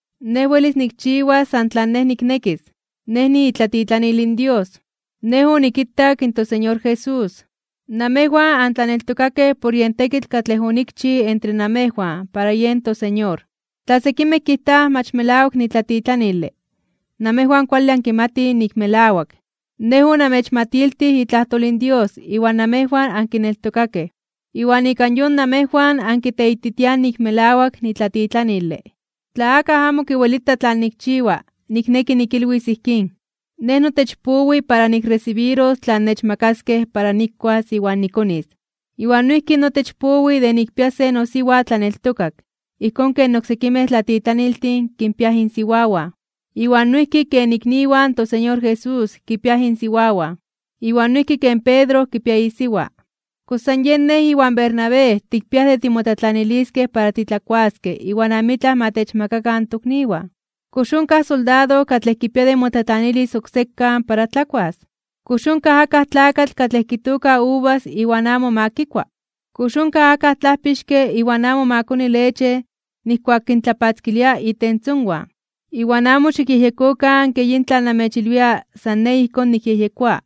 Nej welis nikchiwas san tlan nej niknekis. Nej niitlatitlanil in Dios. Nej onikitak in toSeñor Jesús. Namejwan antlaneltokakej por yen tekitl katlej onikchij entre namejwan para yen toSeñor. Tla sekimej kijtaj mach melawak nitlatitlanile, namejwan kuale ankimatij nik melawak. Nej onamechmatiltij itlajtol in Dios iwan namejwan ankineltokakej, iwan ika yon namejwan ankiteititiaj nik melawak nitlatitlanile. Tla akaj amo kiwelita tlan nikchiwa, nikneki nikilwis ijkín. Nej notech powi para nikresibiros tlan nechmakaskej para nikuas iwan nikonis, iwan noijki notech powi de nikpias se nosiwa tlaneltokak, ijkón ken oksekimej tlatitlaniltin kinpiaj insiwawan, iwan noijki ken ikniwan in toSeñor Jesús kipiaj insiwawan, iwan noijki ken Pedro kipia isiwa. ¿Kox san yen nej iwan Bernabé tikpiaj de timotlatlaniliskej para titlakuaskej iwan amitlaj ma techmakakan in tokniwan? ¿Kox onkaj soldado katlej kipia de motlatlanilis oksekan para tlakuas? ¿Kox onkaj akaj tlakatl katlej kitooka uvas iwan amo ma kikua? ¿Kox onkaj akaj tlajpixke iwan amo ma koni leche nijkuak kintlapatzkilia itentzonwan? Iwan amo xikyejyekokan ke yin tlan namechilwia san nej ijkón nikyejyekoa,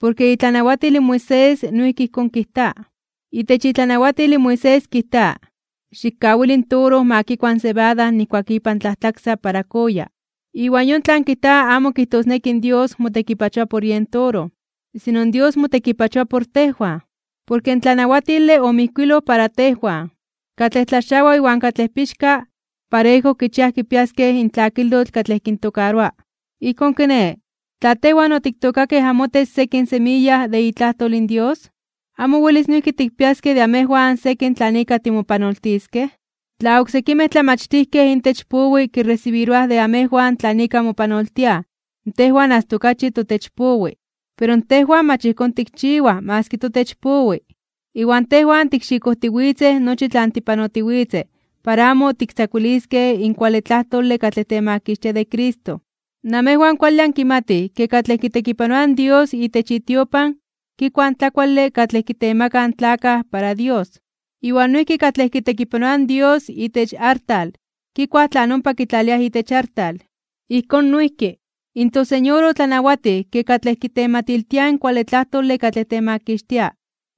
porke itlanawatil in Moisés noijki ijkón kijta. Itech itlanawatil in Moisés kijta: “Xikkawili in toro ma kikua in sebada nijkuak ipan tlajtlaksa para kooya.” Iwan yon tlan kijta amo kijtosneki in Dios motekipachoa por yen toro. Sino Dios motekipachoa por tejwan. Porke in tlanawatile omijkuiloj para tejwan. Katlej tlaxawa iwan katlej pixka, parejo kichiaj kipiaskej in tlakilotl katlej kintokaroa. Ijkón kiné, tla tejwan otiktookakej amotech sekin semiya de itlajtol in Dios, ¿amo welis noijki tikpiaskej de amejwan sekin tlan ika timopanoltiskej? Tla oksekimej tlamachtijkej intech powi kiresibiroaj de amejwan tlan ika mopanoltiaj, tejwan asta okachi totech powi. Pero tejwan mach ijkón tikchiwaj maski totech powi, iwan tejwan tikxikojtiwitzej nochi tlan tipanotiwitzej para amo tiktzakuiliskej in kuale tlajtole katlej temakixtia de Cristo. Namejwan kuale ankimatij ke katlej kitekipanoaj in Dios itech itiopan, kikuaj in tlakuale katlej kitemakaj in tlakaj para Dios. Iwan noijki katlej kitekipanoaj in Dios itech artal, kikuaj tlan ompa kitlaliaj itech artal. Ijkón noijki, in toSeñor otlanawatij ke katlej kitematiltiaj in kuale tlajtole katlej temakixtia,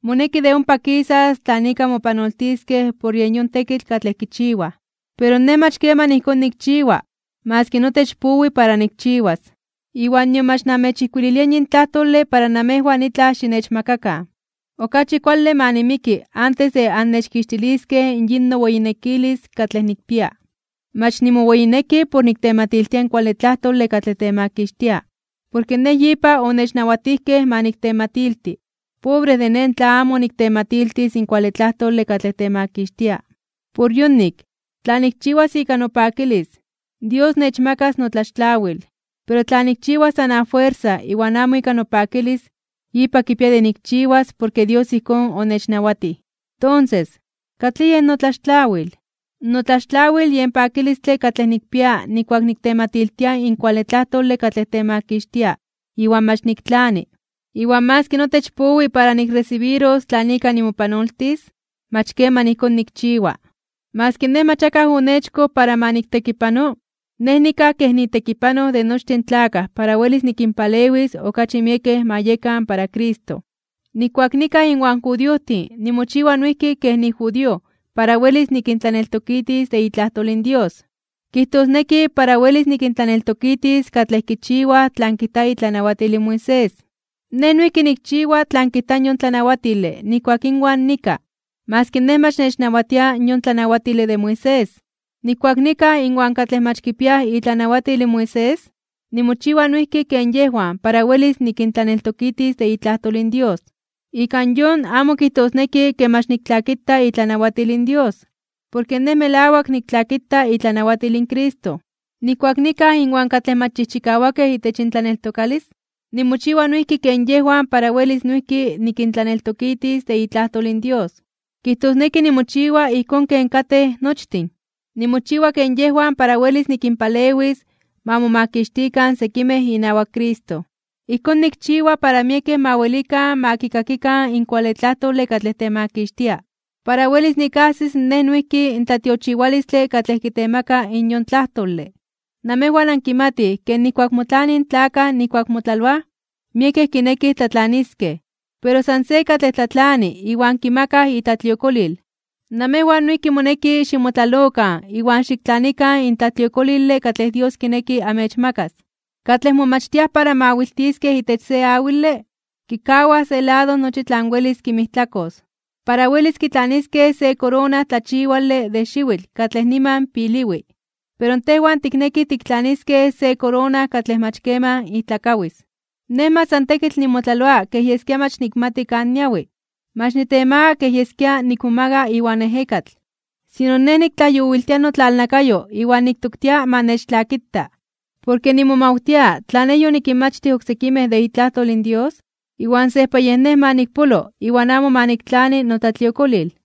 moneki de ompa kisas tlan ika mopanoltiskej por yen yon tekitl katlej kichiwaj. Pero nej mach keman ijkón nikchiwa, maski notech powi para nikchiwas. Iwan nion mach namechijkuililia yin tlajtole para namejwan itlaj xinechmakakan. Okachi kuale ma nimiki antes de annechkixtiliskej yin noweyinekilis katlej nikpia. Mach nimoweyineki por niktematiltia in kuale tlajtole katlej temakixtia, porke nej yipa onechnawatijkej ma niktematilti. ¡Pobre de nej tla amo niktematiltis in kuale tlajtole katlej temakixtia! Por yonik, tla nikchiwas ika nopakilis, Dios nechmakas notlaxtlawil. Pero tla nikchiwas san afuersa iwan amo ika nopakilis, yipa kipia de nikchiwas porke Dios ijkón onechnawatij. Tonses, ¿katlij yen notlaxtlawil? Notlaxtlawil yen pakilistle katlej nikpia nijkuak niktematiltia in kuale tlajtole katlej temakixtia iwan mach niktlani. Iwan maski notech powi para nikresibiros tlan ika nimopanoltis, mach keman ijkón nikchiwa. Maski nej mach akaj onechkoj para ma niktekipano, nej nikaj kej nitekipanoj de nochtin in tlakaj para welis nikinpalewis okachi miekej ma yekan para Cristo. Nijkuak nikaj inwan judiojtin nimochiwa noijki kej nijudío para welis nikintlaneltokitis de itlajtol in Dios. Kijtosneki para welis nikintlaneltokitis katlej kichiwaj tlan kijta itlanawatil in Moisés, nej noijki nikchiwa tlan kijta in yon tlanawatile nijkuak inwan nikaj, maski nej mach nechnawatia yon tlanawatile de Moisés. Nijkuak nikaj inwan katlej mach kipiaj itlanawatil in Moisés, nimochiwa noijki ken yejwan para welis nikintlaneltokitis de itlajtol in Dios. Ika yon, amo kijtosneki ke mach niktlakita itlanawatil in Dios, porke nej melawak niktlakita itlanawatil in Cristo. Nijkuak nikaj inwan katlej mach chijchikawakej itech intlaneltokalis, nimochiwa noijki ken yejwan para welis noijki nikintlaneltokitis de itlajtol in Dios. Kijtosneki nimochiwa ijkón ken katej nochtin. Nimochiwa ken yejwan para welis nikinpalewis ma momakixtikan sekimej inawak Cristo. Ijkón nikchiwa para miekej ma welikan ma kikakikan in kuale tlajtole katlej temakixtia, para welis nikajsis nej noijki in tlatiochiwalistle katlej kitemaka in yon tlajtole. Namejwan ankimatij ke nijkuak motlanij in tlakaj nijkuak motlaloaj, miekej kinekij tlatlaniskej, pero san se katlej tlatlani iwan kimakaj itlatliokolil. Namejwan noijki moneki ximotlalokan iwan xiktlanikan in tlatliokolile katlej Dios kineki amechmakas. Katlej momachtiaj para mawiltiskej itech se awile, kikawaj se lado nochi tlan welis kinmijtlakos, para welis kitlaniskej se korona tlachiwale de xiwitl katlej niman piliwi. Pero tejwan tiknekij tiktlaniskej se korona katlej mach keman ijtlakawis. Nej mach san tekitl nimotlaloa kej yeskia mach nikmati kan niawi. Mach nitemaga kej yeskia nikmomaga iwan ejekatl. Sino, nej niktlajyowiltia notlalnakayo iwan niktoktia ma nechtlakita, porke nimomawtia tla nej yonikinmachtij oksekimej de itlajtol in Dios, iwan sejpa yej nej ma nikpolo iwan amo ma niktlani notlatliokolil.